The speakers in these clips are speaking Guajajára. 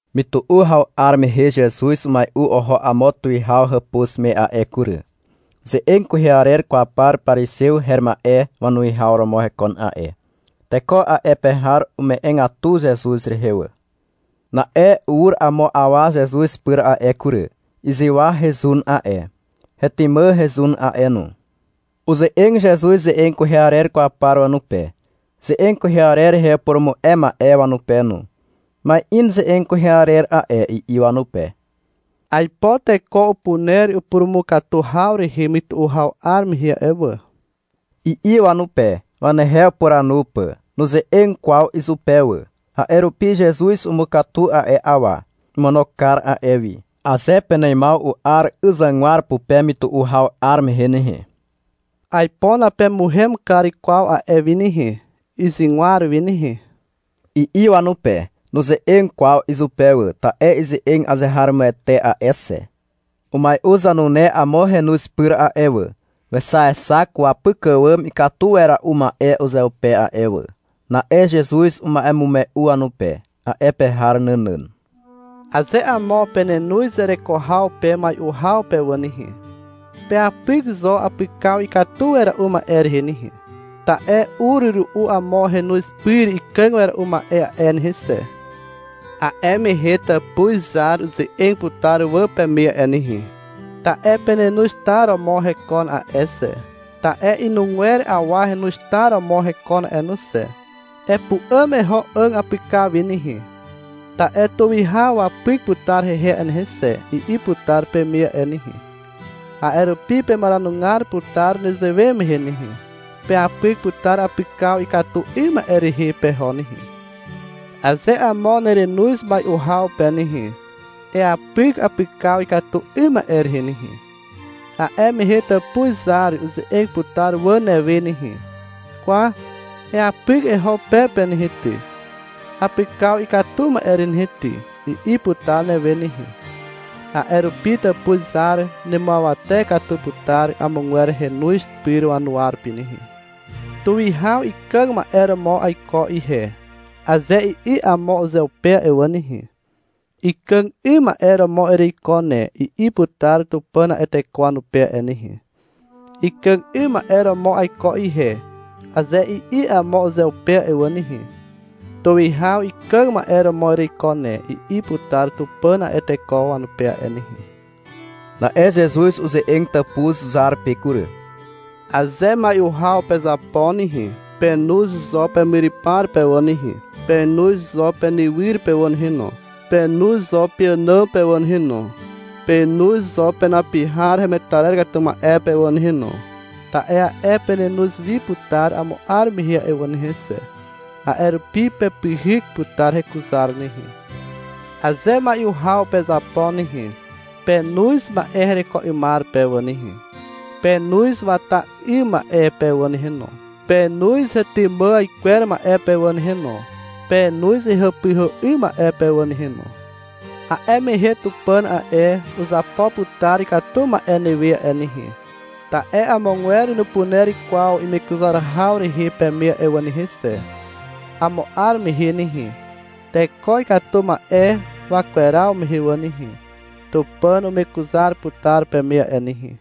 Mytu'u haw 'ar mehe Zezuz umai'u oho amo tuwihaw hàpuz me a'e kury. Ze'eg kwehe arer kwaw par parizew her ma'e wanuwihaw romo hekon a'e. Teko a'e pe har ume'egatu Zezuz rehe wà. Na'e ur amo awa Zezuz pyr a'e kury. Izywa hezun a'e. Hetymà hezun a'e no. Uze'eg Zezuz ze'eg kwehe arer kwaw par wanupe, ze'eg kwehe arer rehe upurumu'e ma'e wanupe no. — Ma'in ze'eg kwehe arer a'e, i'i wanupe. — Aipo teko upuner upurumukatu haw rehe mytu'u haw 'ar mehe a'e wà, i'i wanupe, wanehe upuranu pà. Nuze'eg kwaw izupe wà. A'e rupi Zezuz umukatu a'e awa. Omono kar a'e wi. Aze peneimaw u'ar 'yzygwar pupe mytu'u haw 'ar mehe nehe, aipo napemuhem kar kwaw a'e wi nehe, 'yzygwar wi nehe, i'i wanupe. Nuze'eg kwaw izupe wà, ta'e ize'eg azeharomoete a'e xe. — Umai'u zanune amo henoz pyr a'e wà, wexaexak wapyk àwàm ikatu wera'u ma'e uzeupe a'e wà. Na'e Zezuz uma'emume'u wanupe, a'e pe har nànàn. Aze amo penenoz zereko haw pe mai'u haw pe wà nehe, peapyk zo apykaw ikatu wera'u ma'e rehe nehe. Ta'e ur ru'u amo henoz pyr ikàg wera'u ma'e a'e nehe xe. A'e mehe tàpuz zar uze'eg putar wà peme a'e nehe. Ta'e penenoz tar romo hekon a'e xe, ta'e inugwer awa henoz tar romo hekon a'e no xe. Epu'àm eho 'àg apykaw wi nehe, ta'e tuwihaw wapyk putar hehe a'e nehe xe, i'i putar peme a'e nehe. A'e rupi pemaranugar putar nezewe mehe nehe. Peapyk putar apykaw ikatu 'ym ma'e rehe peho nehe. Aze amo nerenoz mai'u haw pe nehe, eapyk apykaw ikatu 'ym ma'e rehe nehe. A'e mehe tàpuz zar uze'eg putar wà newe nehe. — Kwa, eapyk eho pe pe nehe ty, apykaw ikatu ma'e rehe nehe ty, i'i putar newe nehe. A'e rupi tàpuz izar nemuawate katu putar amogwer henoz pyr wanuwa rupi nehe. Tuwihaw ikàg ma'e romo aiko ihe, aze i'i amo uzeupe a'e wà nehe, — Ikàg 'ym ma'e romo ereiko ne, i'i putar Tupàn a'e teko wanupe a'e nehe. Ikàg 'ym ma'e romo aiko ihe, aze i'i amo uzeupe a'e wà nehe, — Tuwihaw ikàg ma'e romo ereiko ne, i'i putar Tupàn a'e teko wanupe a'e nehe. Na'e Zezuz uze'eg tàpuz zar pe kury. — Aze mai'u haw pezapo nehe, penoz zo pemyrypar pe wà nehe, penoz zo penywyr pe wà nehe no, penoz zo peànàm pe wà nehe no. Penoz zo penapi har hemetarer katu ma'e pe wà nehe no. Ta'e a'e penenoz wi putar amo 'ar mehe a'e wà nehe xe. A'e rupi pepyhyk putar hekuzar nehe. Aze mai'u haw pezapo nehe, penoz ma'e hereko 'ymar pe wà nehe, penoz wata 'ym ma'e pe wà nehe no, penoz hetymà aikwer ma'e pe wà nehe no, penoz hehàpyhà 'ym ma'e pe wà nehe no. A'e mehe Tupàn a'e, uzapo putar ikatu ma'e newe a'e nehe. Ta'e amogwer nupuner kwaw imekuzar haw rehe peme a'e wà nehe xe. Amo 'ar mehe nehe, teko ikatu ma'e wakweraw mehe wà nehe, Tupàn umekuzar putar peme a'e nehe.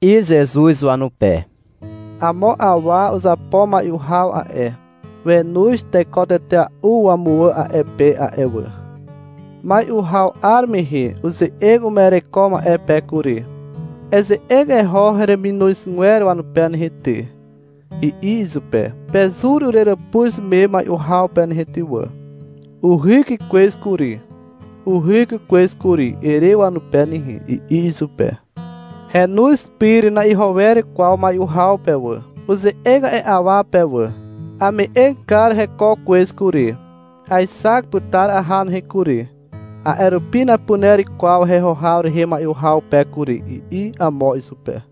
I'i Zezuz izupe. — Amo awa uzapo mai'u haw a'e. Wenoz teko tetea'u wamuwà a'e pe a'e wà. Mai'u haw 'ar mehe uze'eg uma'ereko ma'e pe kury. — Eze'eg eho hereminozgwer wanupe nehe ty, i'i izupe. — Pezur ureràpuz me mai'u haw pe nehe ty wà, uhyk kwez kury, uhyk kwez kury, ere wanupe nehe, i'i izupe. Henoz pyr na'iho wer kwaw mai'u haw pe wà. Uze'eg a'e awa pe wà. — Ame'eg kar heko kwez kury. Aexak putar aha nehe kury, a'e rupi napuner kwaw heho haw rehe mai'u haw pe kury, i'i amo izupe.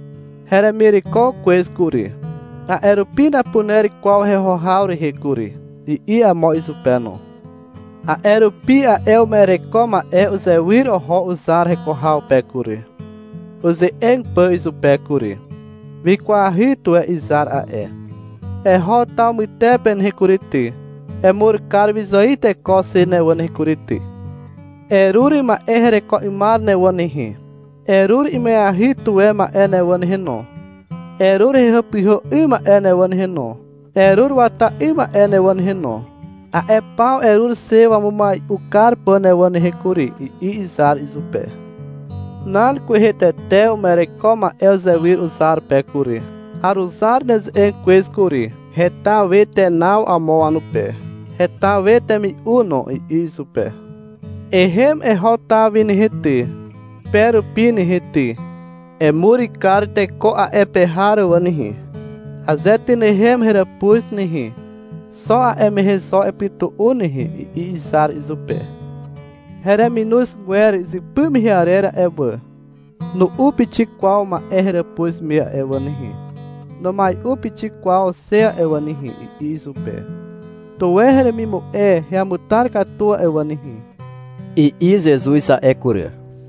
Heremireko kwez kury, a'e rupi napuner kwaw heho haw rehe kury, i'i amo izupe no. A'e rupi a'e uma'ereko ma'e uzewyr oho uzar heko haw pe kury, uze'eg pà izupe kury. Wikwahy tuwe izar a'e. — Eho taw mytepe nehe kury ty, emur kar wyzài teko xe ne wà nehe kury ty. Erur ma'e hereko 'ymar ne wà nehe, erur ima'eahy tuwe ma'e ne wà nehe no, erur hehàpyhà 'ym ma'e ne wà nehe no, erur wata 'ym ma'e ne wà nehe no. A'e paw erur xe wamumai'u kar pà ne wà nehe kury, i'i izar izupe. Nan kwehe tete uma'ereko ma'e uzewyr uzar pe kury. — Aruzar neze'eg kwez kury. Heta we tenaw amo wanupe, heta we temi'u no, i'i izupe. — Ehem eho taw wi nehe ty, pe rupi nehe ty. Emur kar teko a'e pe har wà nehe. Aze tynehem heràpuz nehe, xo a'e mehe zo epytu'u nehe, i'i izar izupe. — Hereminozgwer izypy mehe arer a'e wà, nu'u pixik kwaw ma'e heràpuz me a'e wà nehe, numai'u pixik kwaw xe a'e wà nehe, i'i izupe. — Tuwe heremimu'e heamutar katu a'e wà nehe, i'i Zezuz a'e kury.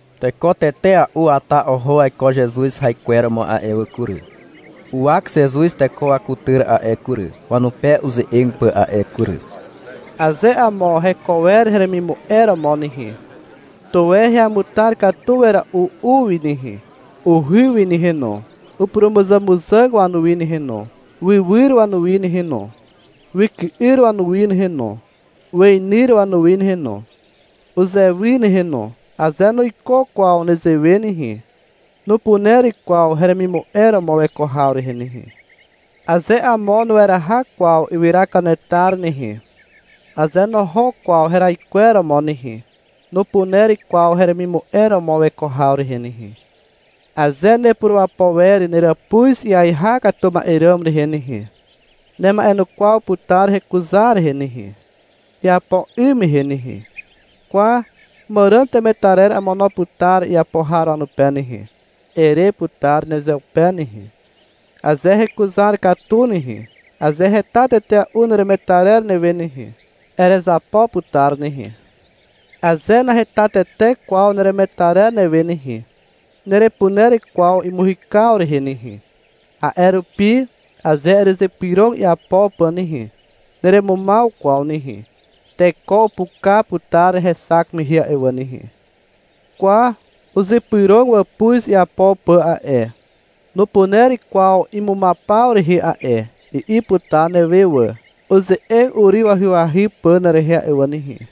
Teko tetea'u wata oho waiko Zezuz haikweromo a'e wà kury. Uwak Zezuz teko wakutyr a'e kury, wanupe uze'eg pà a'e kury. Aze amo heko wer heremimu'e romo nehe, tuwe heamutar katu wera'u u wi nehe, uhy wi nehe no, upurumuzàmuzàg wanuwi nehe no, wywyr wanuwi nehe no, wyky'yr wanuwi nehe no, weinyr wanuwi nehe no, uzewi nehe no. Aze nuiko kwaw nezewe nehe, nupuner kwaw heremimu'e romo weko haw rehe nehe. Aze amo nueraha kwaw ywyra kanetar nehe, aze noho kwaw heraikweromo nehe, nupuner kwaw heremimu'e romo weko haw rehe nehe. — Aze nepurapo wer neràpuz iaiha katu ma'e ràm rehe nehe, nema'enukwaw putar hekuzar rehe nehe, iapo 'ym mehe nehe. — Kwa, màràn temetarer amono putar iapo har wanupe nehe, ere putar nezeupe nehe. Aze hekuzar katu nehe, aze heta tetea'u neremetarer newe nehe, erezapo putar nehe. Aze naheta tete kwaw neremetarer newe nehe, nerepuner kwaw imuhykaw rehe nehe. A'e rupi, aze erezypyrog iapo pà nehe, neremumaw kwaw nehe. Teko upuka putar hexak mehe a'e wà nehe. Kwa, uzypyrog wàpuz iapo pà a'e, nupuner kwaw imumaw paw rehe a'e, i'i putar newe wà, uze'eg uryw ahyahy pà nerehe a'e wà nehe.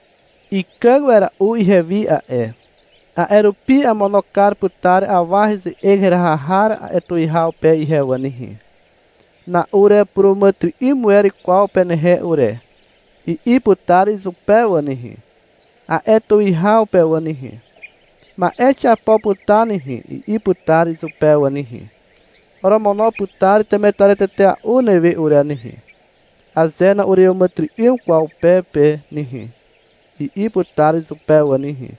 Ikàg wera'u ihewi a'e, a'e rupi amono kar putar awa heze'eg heraha har a'e tuwihaw pe ihe wà nehe. — Na'urepuràmàtyry'ym wer kwaw penehe ure, i'i putar izupe wà nehe, a'e tuwihaw pe wà nehe. — Ma'e xiapo putar nehe, i'i putar izupe wà nehe. — Oromono putar temetarer tetea'u newe ure nehe, aze na'ureàmàtyry'ym kwaw pe pe nehe, i'i putar izupe wà nehe,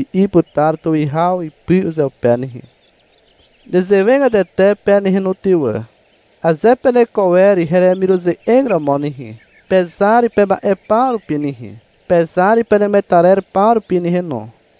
i'i putar tuwihaw ipy uzeupe nehe. Nezewegatete pe nehe no ty wà. Aze peneko wer heremiruze'eg romo nehe, pezar pema'e paw rupi nehe, pezar penemetarer paw rupi nehe no.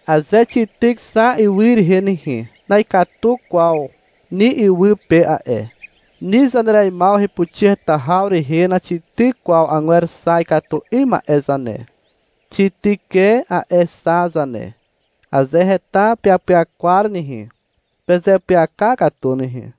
Aze xityk xa ywy rehe nehe, na'ikatu kwaw ni ywy pe a'e. Ni zanereimaw hepuxi heta haw rehe naxityk kwaw agwer xa ikatu 'ym ma'e zane. Xityk e a'e xa zane. Aze heta peapyakwar nehe, pezeapyaka katu nehe.